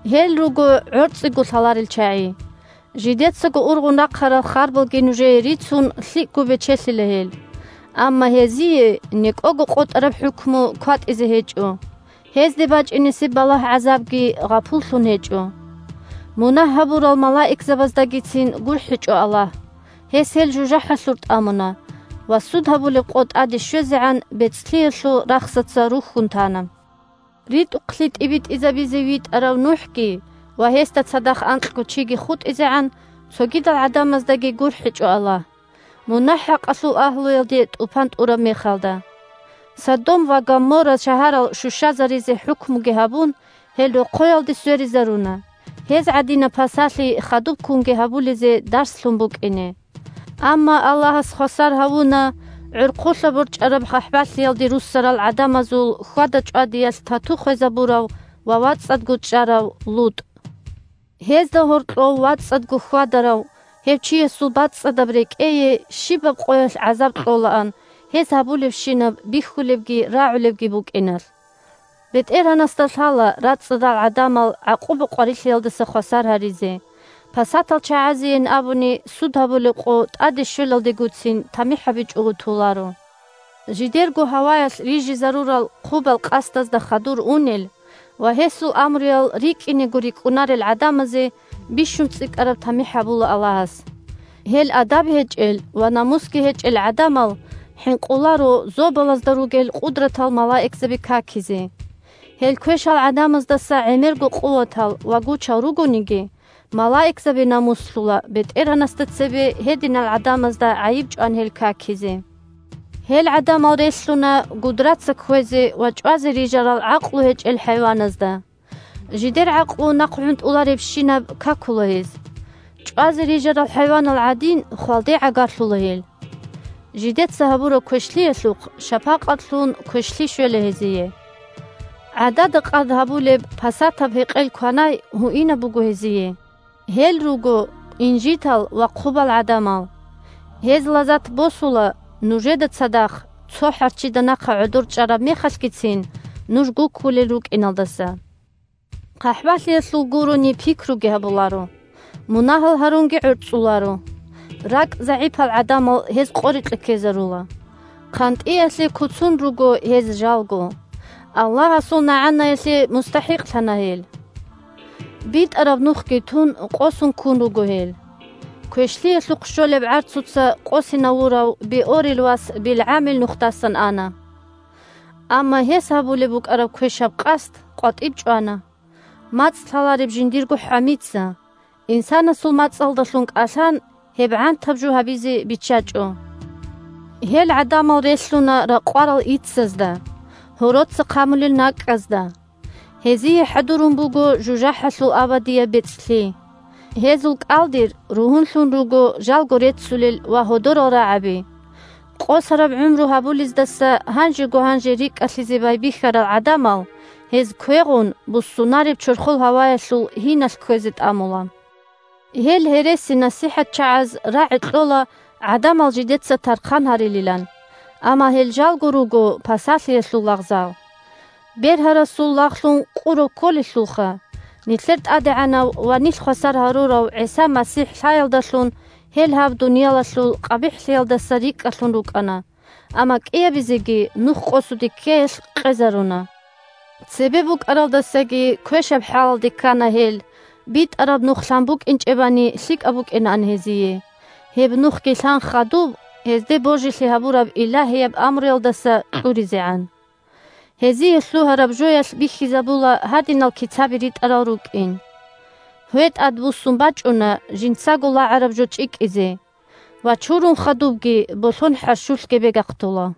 Гьел руго гӀорцӀиго лъаларел чагӀи. Жидецаго ургъун рахъарал харбалги нужее рицун, лъикӀго бечелъила гьел. Амма гьезие некӀого къотӀараб хӀукму кватӀизе гьечӀо, гьезде бачӀинесеб балагь-гӀазабги гъапуллъун гьечӀо! Мунагь гьабурал малаикзабаздагицин гурхӀичӀо Аллагь: гьес гьел жужахӀалъур тӀамуна ва Суд гьабулеб къо тӀаде щвезегӀан бецӀлъиялъул рахсаца рухьун тана. РитӀухълъи тӀибитӀизабизе витӀарав НухӀги ва гьесда цадахъ анкьго чиги хутӀизегӀан, цогидал гӀадамаздаги гурхӀичӀо Аллагь, мунагь-хӀакъалъул агьлуялде тӀупан тӀураб мехалда. Содом ва Гоморра шагьарал щущазаризе хӀукмуги гьабун, гьел рохъоялде сверизаруна, гьез гӀадинаб пасалъи хадубккунги гьабулезе дарслъун букӀине. Амма Аллагьас хвасар гьавуна гӀорхъулъа борчӀараб хъахӀбалъиялде руссарал гӀадамазул хьвада-чӀвадиялъ тату хвезабурав ва вацӀцӀадго чӀарав ЛутӀ. Гьезда гьоркьов вацӀцӀадго хьвадарав гьев чиясул бацӀцӀадаб рекӀее щибаб къоялъ гӀазаб кьолаан гьез гьабулебщинаб бихьулебги рагӀулебги букӀиналъ. БетӀергьанасда лъала рацӀцӀадал гӀадамал гӀакъуба-къварилъиялдаса хвасар гьаризе, пасатал чагӀазейин абуни, Суд гьабулеб къо тӀаде щвелалдегоцин тамихӀ гьабичӀого толаро. Жидерго гьаваялъ рижизарурал хъубал къасдазда хадур унел ва гьесул амруял рикӀкӀинего рикӀкӀунарел гӀадамазе бищун цӀикӀкӀараб тамихӀ гьабула Аллагьас. Гьел адаб гьечӀел ва намусги гьечӀел гӀадамал хӀинкъуларо зобалазда ругел къудратал малаикзаби какизе. Гьел квешал гӀадамаздаса гӀемерго къуватал ва гучал ругониги, малаикзаби намуслъула БетӀергьанасда цебе гьединал гӀадамазда гӀайиб чӀван гьел какизе. Гьел гӀадамал релълъуна гудраца кквезе ва чӀвазе рижарал гӀакълу гьечӀел хӀайваназда. Жидер гӀакълу нахъгӀунтӀуларебщинаб какула гьез. ЧӀвазе рижарал хӀайванал гӀадин, хвалде гӀагарлъула гьел. Жидеца гьабураб квешлъиялъухъ шапакъатлъун квешлъи щвела гьезие. ГӀадада-къад гьабулеб пасатаб гьекъел-кванай гьуинаб буго гьезие. Гьел руго инжитал ва хъубал гӀадамал. Гьез лазат босула нужеда цадахъ цо хӀарччида нахъа гӀодор чӀараб мехалъгицин нуж гуккулел рукӀиналдаса. ХъахӀбалъиялъул гурони пикруги гьабуларо, мунагьал гьарунги гӀорцӀуларо. РакӀ загӀипал гӀадамал гьез къорикье ккезарула. ХъантӀиялъе куцун руго гьез жалго. Аллагьасул нагӀанаялъе мустахӀикълъана гьел! БитӀараб нухги тун, къосун ккун руго гьел. Квешлъиялъухъ щолеб гӀарцуца къосинавурав Беъорил вас БилгӀамил нухдасан ана. Амма гьес гьабулеб букӀараб квешаб къасд къватӀиб чӀвана: мацӀ лъалареб жиндирго хӀамица, инсанасул мацӀалдалъун кӀалъан, гьеб гӀантаб жо гьабизе биччачӀо. Гьел гӀадамал релълъуна ракъварал иццазда, гьороца хъамулел накӀкӀазда! Гьезие хӀадурун буго жужахӀалъул абадияб бецӀлъи. Гьезул кӀалдир ругьунлъун руго жалго реццулел ва гьодорал рагӀаби. Къосараб гӀумру гьабулездаса гьанжего-гьанже рикӀкӀалъизе байбихьарал гӀадамал гьез квегъун буссунареб чорхол гьаваялъул гьиналъ кквезе тӀамула. Гьел гьересинасихӀатчагӀаз рагӀи кьола гӀадамал жидеца тархъан гьарилилан, амма гьел жалго руго пасалъиялъул лагъзал. Бергьарасул лагълъун къурав кколелъулха! Нилъер ТӀадегӀанав ва нилъ хвасар гьарурав ГӀиса МасихӀ лъаялдалъун гьел гьаб дуниялалъул къабихӀлъиялдаса рикӀкӀалъун рукӀана, амма кӀиабизеги нухкъосуде ккеялъ къезаруна. Цебе букӀаралдасаги квешаб хӀалалде ккана гьел БитӀараб Нух лъан букӀинчӀебани лъикӀаб букӀинаан гьезие, гьеб нухги лъан хадуб гьезде божилъи гьабураб илагьияб амруялдаса кьуризегӀан! Гьезие лъугьараб жоялъ бихьизабула гьадинал кицаби ритӀарал рукӀин: «Гьве тӀадбуссун бачӀуна жинцаго лагӀараб жо чӀикӀизе» ва «Чурун хадубги болъон хӀарщулъ гебегахъдула».